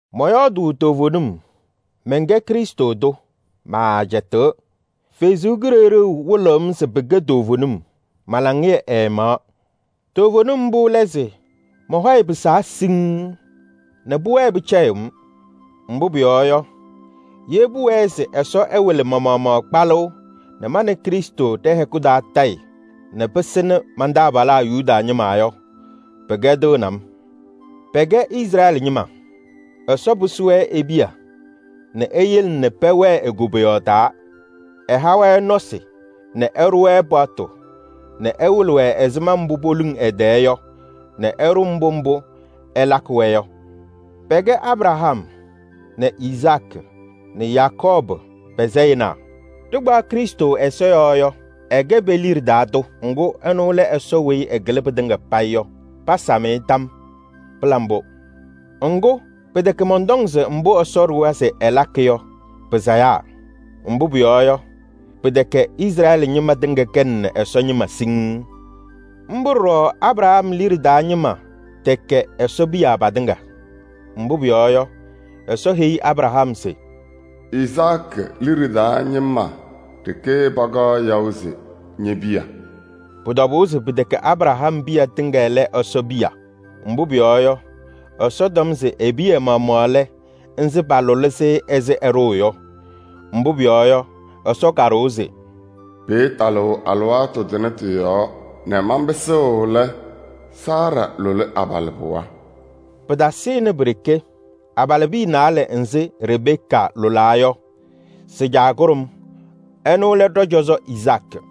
Mɔyɔɔdʋʋ toovenim, mɛnkɛ Krɩstʋ tʋ, maacɛtɩɣ. Ɛsɔ Kalɩzaɣ wɩlɩɣ-m se pɩkɛ toovenim, ma-laŋɩyɛ ɛɛmaɣ: toovenim mbʋ lɛ se: mɔ-hɔyɛ pɩsaa siŋŋ nɛ pʋwɛɛ pɩcɛyɩɣ-m. Mbʋ pʋyɔɔ yɔ, ye pʋwɛɛ se Ɛsɔ ɛwɩlɩ ma-maɣmaɣ kpalʋʋ nɛ ma nɛ Krɩstʋ ɖɛ-hɛkʋ taa tayɩ nɛ pɩsɩnɩ man-taabalaa Yuda ñɩma yɔ, pɩkɛdɩɣnɩ-m. Pɛkɛ Izrɛɛlɩ ñɩma: Ɛsɔ pɩsɩ-wɛ e-piya nɛ eyele nɛ pɛwɛɛ e-koboyaɣ taa. Ɛha-wɛ nɔsɩ nɛ ɛɖʋ-wɛ paɣtʋ nɛ ɛwɩlɩ-wɛ ɛzɩma mbʋ poluŋ ɛ-tɛɛ yɔ nɛ ɛɖʋ mbʋ mbʋ ɛlakɩ-wɛ yɔ. Pɛkɛ Abraham nɛ Izaakɩ nɛ Yakɔɔbʋ pa-sayɩnaa. Ɖɩkpaɣ Krɩstʋ ɛza yɔɔ yɔ, ɛkɛ pe-liɖe taa tʋ. Ŋgʋ, ɛnʋ lɛ Ɛsɔ weyi ɛkɩlɩ pɩtɩŋa payɩ yɔ. Pasam-ɩ tam yɔɔ. Pɩla mbʋ! Ŋgʋ, pɩtɛkɛ mɔntɔŋ se mbʋ Ɛsɔ ɖʋwa se ɛlakɩ yɔ pɩsayaa. Mbʋ pʋyɔɔ yɔ, pɩtɛkɛ Izrɛɛlɩ ñɩma tɩŋa kɛnɩ Ɛsɔ ñɩma siŋŋ. Mbʋ ɖɔɖɔ Abraham liɖe taa ñɩma tɛkɛ Ɛsɔ piya patɩŋa. Mbʋ pʋyɔɔ yɔ, Ɛsɔ heyi Abraham se: “Izaakɩ liɖe taa ñɩma ɖeke pakaɣ yaʋ se ñe-piya.” Pʋ-tɔbʋʋ se pɩtɛkɛ Abraham piya tɩŋa lɛ Ɛsɔ piya, mbʋ pʋyɔɔ yɔ, Ɛsɔ tɔm se e-piya maɣmaɣ lɛ nzɩ palʋlɩ-sɩ ɛzɩ ɛɖʋʋ yɔ. Mbʋ pʋyɔɔ yɔ, Ɛsɔ kaɖʋwa se: “Pɩɩtalɩɣ alɩwaatʋ tʋnɛ tɩ-yɔɔ nɛ manpɩsɩɣ lɛ, Saara lʋlɩ abalɩbɩɣa.” Pɩtasɩnɩ pi-ɖeke. Abalɩbiya naalɛ nzɩ Rebeka lʋlaa yɔ, sɩ-caa kʋɖʋm, ɛnʋ lɛ ɖɔ-cɔzɔ Izaakɩ.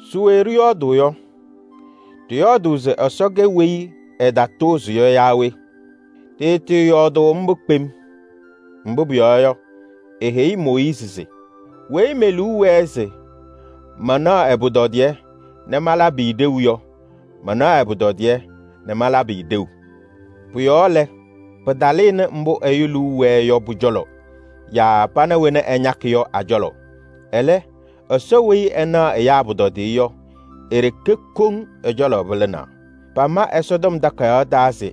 Se we ɖɩyɔɔdʋʋ yɔ? Ɖɩyɔɔdʋʋ se Ɛsɔ kɛ kɩtatʋʋzʋʋ naa we? Ɖɩɩtɩɩyɔɔdʋʋ mbʋ kpem! Mbʋ pʋyɔɔ yɔ, eheyi Mooyiizi se: weyi me-liu wɛɛ se manaɣ ɛ-pʋtɔdɩyɛ nɛ malabɩ-ɩ ɖeu yɔ, manaɣ ɛ-pʋtɔdɩyɛ nɛ malabɩ-ɩ ɖeu. Pʋ-yɔɔ lɛ, pɩtalɩnɩ mbʋ ɛyʋ liu wɛɛ yɔ pʋ-cɔlɔ yaa pana wena ɛñakɩ yɔ a-cɔlɔ. Ɛlɛ, Ɛsɔ weyi ɛnaɣ ɛyaa pʋtɔdɩyɛ yɔ, e-ɖeke koŋ ɛ-cɔlɔ pɩlɩnaa. Pama Ɛsɔtɔm Takayaɣ taa se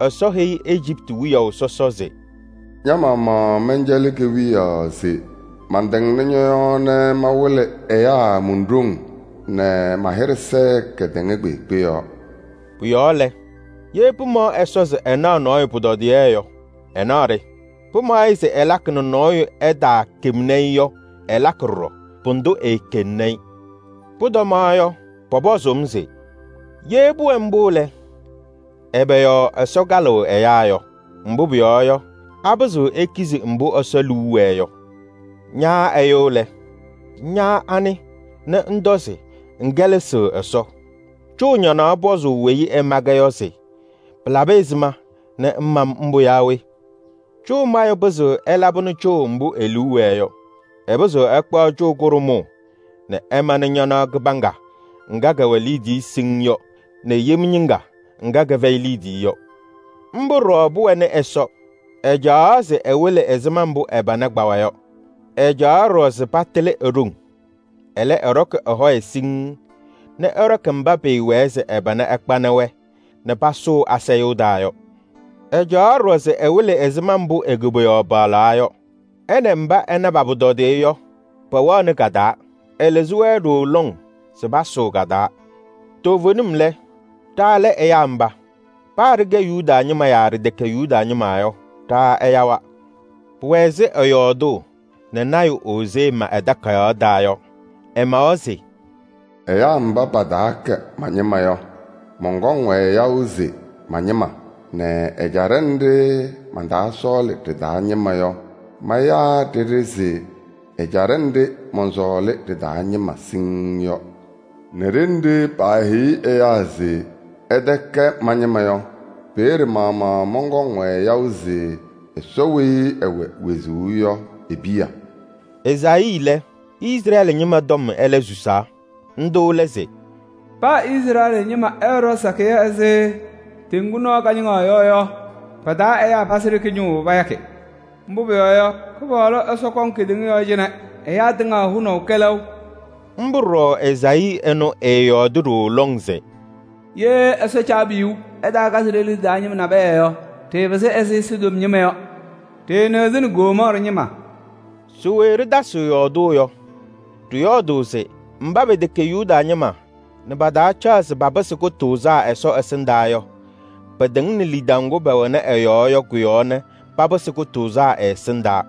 Ɛsɔ heyi Ejiptɩ wiyaʋ sɔsɔ se: “Ña-maɣmaɣ mɛncɛlɩ kewiyaɣ se mantɩŋnɩ ñɔ-yɔɔ nɛ mawɩlɩ ɛyaa mon-ɖoŋ nɛ ma-hɩɖɛ sɛɛ kedeŋa kpeekpe yɔɔ.” Pʋ-yɔɔ lɛ, ye pɩmaɣ Ɛsɔ se ɛnaɣ nɔɔyʋ pʋtɔdɩyɛ yɔ, ɛnaɣ-ɖɩ. Pɩmaɣ-ɩ se ɛlakɩ nɛ nɔɔyʋ ɛtaakemni-i yɔ, ɛlakɩ ɖɔɖɔ, pʋdʋ eekeŋni-i. Pʋtɔmaɣ yɔ, pɔpɔzʋʋ-m se: “Ye pʋwɛ mbʋ lɛ, ɛbɛ yɔɔ Ɛsɔ kalɩɣ ɛyaa yɔ? Mbʋ pʋyɔɔ yɔ, apɩzɩɣ ɛkpɛnɩ mbʋ Ɛsɔ liu wɛɛ yɔ?” Ña ɛyʋ lɛ, ña anɩ nɛ ŋtɔ se ŋkɛlɛsɩɣ Ɛsɔ? Cʋʋ ñanaɣ pɔzʋʋ weyi ɛma-kɛ yɔ se: pɩlabɩ ɛzɩma nɛ ŋma-m mbʋ yaa we? Cʋʋ mayʋ pɩzɩɣ ɛlabɩnɩ cʋʋ mbʋ e-liu wɛɛ yɔ: ɛpɩzɩɣ ɛkpaɣ cʋʋ kʋɖʋmʋʋ nɛ ɛmanɩ ñanaɣ kɩbaŋga ŋga kɛwɛ liidiye siŋŋ yɔ nɛ yem ñɩŋga ŋga kɛfɛyɩ liidiye yɔ. Mbʋ ɖɔɖɔ pʋwɛnɩ Ɛsɔ, ɛcaɣaɣ se ɛwɩlɩ ɛzɩma mbʋ ɛ-pana kpawa yɔ. Ɛcaɣaɣ ɖɔɖɔ se patɩlɩ e-ɖoŋ. Ɛlɛ, ɛɖɔkɩ ɛ-hɔyɛ siŋŋ nɛ ɛɖɔkɩ mba pɩɩwɛɛ se ɛ-pana ɛkpanɩ-wɛ nɛ pasʋʋ asayʋʋ taa yɔ. Ɛcaɣaɣ ɖɔɖɔ se ɛwɩlɩ ɛzɩma mbʋ e-koboyaɣ paɣlaa yɔ. Ɛ nɛ mba ɛna pa-pʋtɔdɩyɛ yɔ, pɛwɛɣnɩ ka-taa. Ɛlɩzɩ-wɛ ɖooo lɔŋ se pasʋʋ ka-taa. Toovenim lɛ, ɖa lɛ ɛyaa mba. Paa ɖɩkɛ Yuda ñɩma yaa ɖɩtɛkɛ Yuda ñɩma yɔ, ɖa ɛyawa. Pʋwɛ ɛzɩ ɛyɔɔdʋʋ nɛ Ozee ma ɛ-takayaɣ taa yɔ. Ɛmawa se: “Ɛyaa mba pataakɛ ma-ñɩma yɔ, mɔnkɔŋ-wɛ yaʋ se ma-ñɩma nɛ ɛjaɖɛ nɖɩ mantaasɔɔlɩ ɖɩ-taa ñɩma yɔ, mayaa ɖɩɖɩ se ɛjaɖɛ nɖɩ mɔnsɔɔlɩ ɖɩ-taa ñɩma siŋŋ yɔ. Nɛ ɖenɖe paaheyi ɛyaa se: ‘Ɩtɛkɛ ma-ñɩma yɔ,’ peeye maɣmaɣ pɔkɔŋ-wɛ yaʋ se Ɛsɔ weyi ɛwɛ wezuu yɔ e-piya.” Ezaayii lɛ, Izrɛɛlɩ ñɩma tɔm ɛlɛ susaa. Ndʋ lɛ se: “Paa Izrɛɛlɩ ñɩma ɛɛɖɔ sakɩyɛ ɛzɩ teŋgu nɔɔ kañɩŋa yɔ yɔ, pa-taa ɛyaa pazɩ ɖeke ñʋʋ payakɩ. Mbʋ pʋyɔɔ yɔ, Kɩpaɣlʋ Ɛsɔ kɔŋ kedeŋa yɔɔ cɩnɛ ɛyaa tɩŋa hʋnaʋ kɛlɛʋ.” Mbʋ ɖɔɖɔ Ezaayii ɛnʋ ɛɛyɔɔdɩ ɖooo lɔŋ se: “Ye Ɛsɔ Caabiyuu ɛtaakazɩ ɖe-liɖe taa ñɩma nabɛyɛ yɔ, ɖɩɩpɩsɩ ɛzɩ sodom ñɩma yɔ. Ɖɩɩnɩɣzɩnɩ Gomɔɔrɩ ñɩma.” Se we ɖɩtasɩɣ yɔɔdʋʋ yɔ? Ɖɩyɔɔdʋʋ se: mba pɛtɛkɛ Yuda ñɩma nɛ pataacaɣ se papɩsɩ kʋtʋʋzaa Ɛsɔ ɛsɩndaa yɔ, pɩtɩŋnɩ lidaʋ ŋgʋ pɛwɛnɩ ɛ-yɔɔ yɔ kʋ-yɔɔ nɛ papɩsɩ kʋtʋʋzaa ɛ-ɛsɩndaa.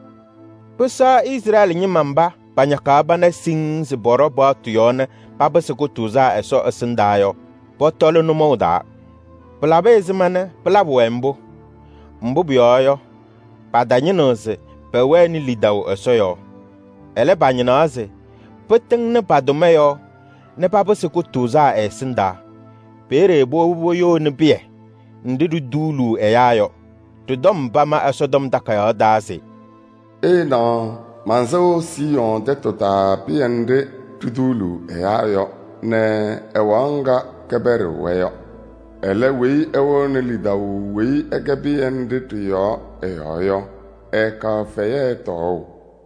Pɩsɛɣ Izrɛɛlɩ ñɩma mba pañakaɣ pana siŋŋ se pɔɖɔ paɣtʋ yɔɔ nɛ papɩsɩ kʋtʋʋzaa Ɛsɔ ɛsɩndaa yɔ, pɔtɔlɩ nʋmɔʋ taa. Pɩlabɩ ɛzɩma nɛ pɩlabɩ-wɛ mbʋ? Mbʋ pʋyɔɔ yɔ, patañɩnɩɣ se pɛwɛnɩ lidaʋ Ɛsɔ yɔɔ. Ɛlɛ, pañɩnaɣ se pɩtɩŋnɩ pa-tʋma yɔɔ nɛ papɩsɩ kʋtʋʋzaa ɛ-ɛsɩndaa. Peeye powobi poyoni pɩyɛ nɖɩ ɖituuluu ɛyaa yɔ. Ɖɩ-tɔm pama Ɛsɔtɔm Takayaɣ taa se: “Ɩɩnaɣ, mansɩɣ Siiyɔɔ ɛjaɖɛ taa pɩyɛ nɖɩ ɖituuluu ɛyaa yɔ nɛ ɛwaɣ ŋga kɛpɛɖɩɣ-wɛ yɔ. Ɛlɛ weyi ɛwɛɣnɩ lidaʋ weyi ɛkɛ pɩyɛ nɖɩ yɔ ɛ-yɔɔ yɔ, ɛɛkaɣ fɛyɛ tɔɔʋ.”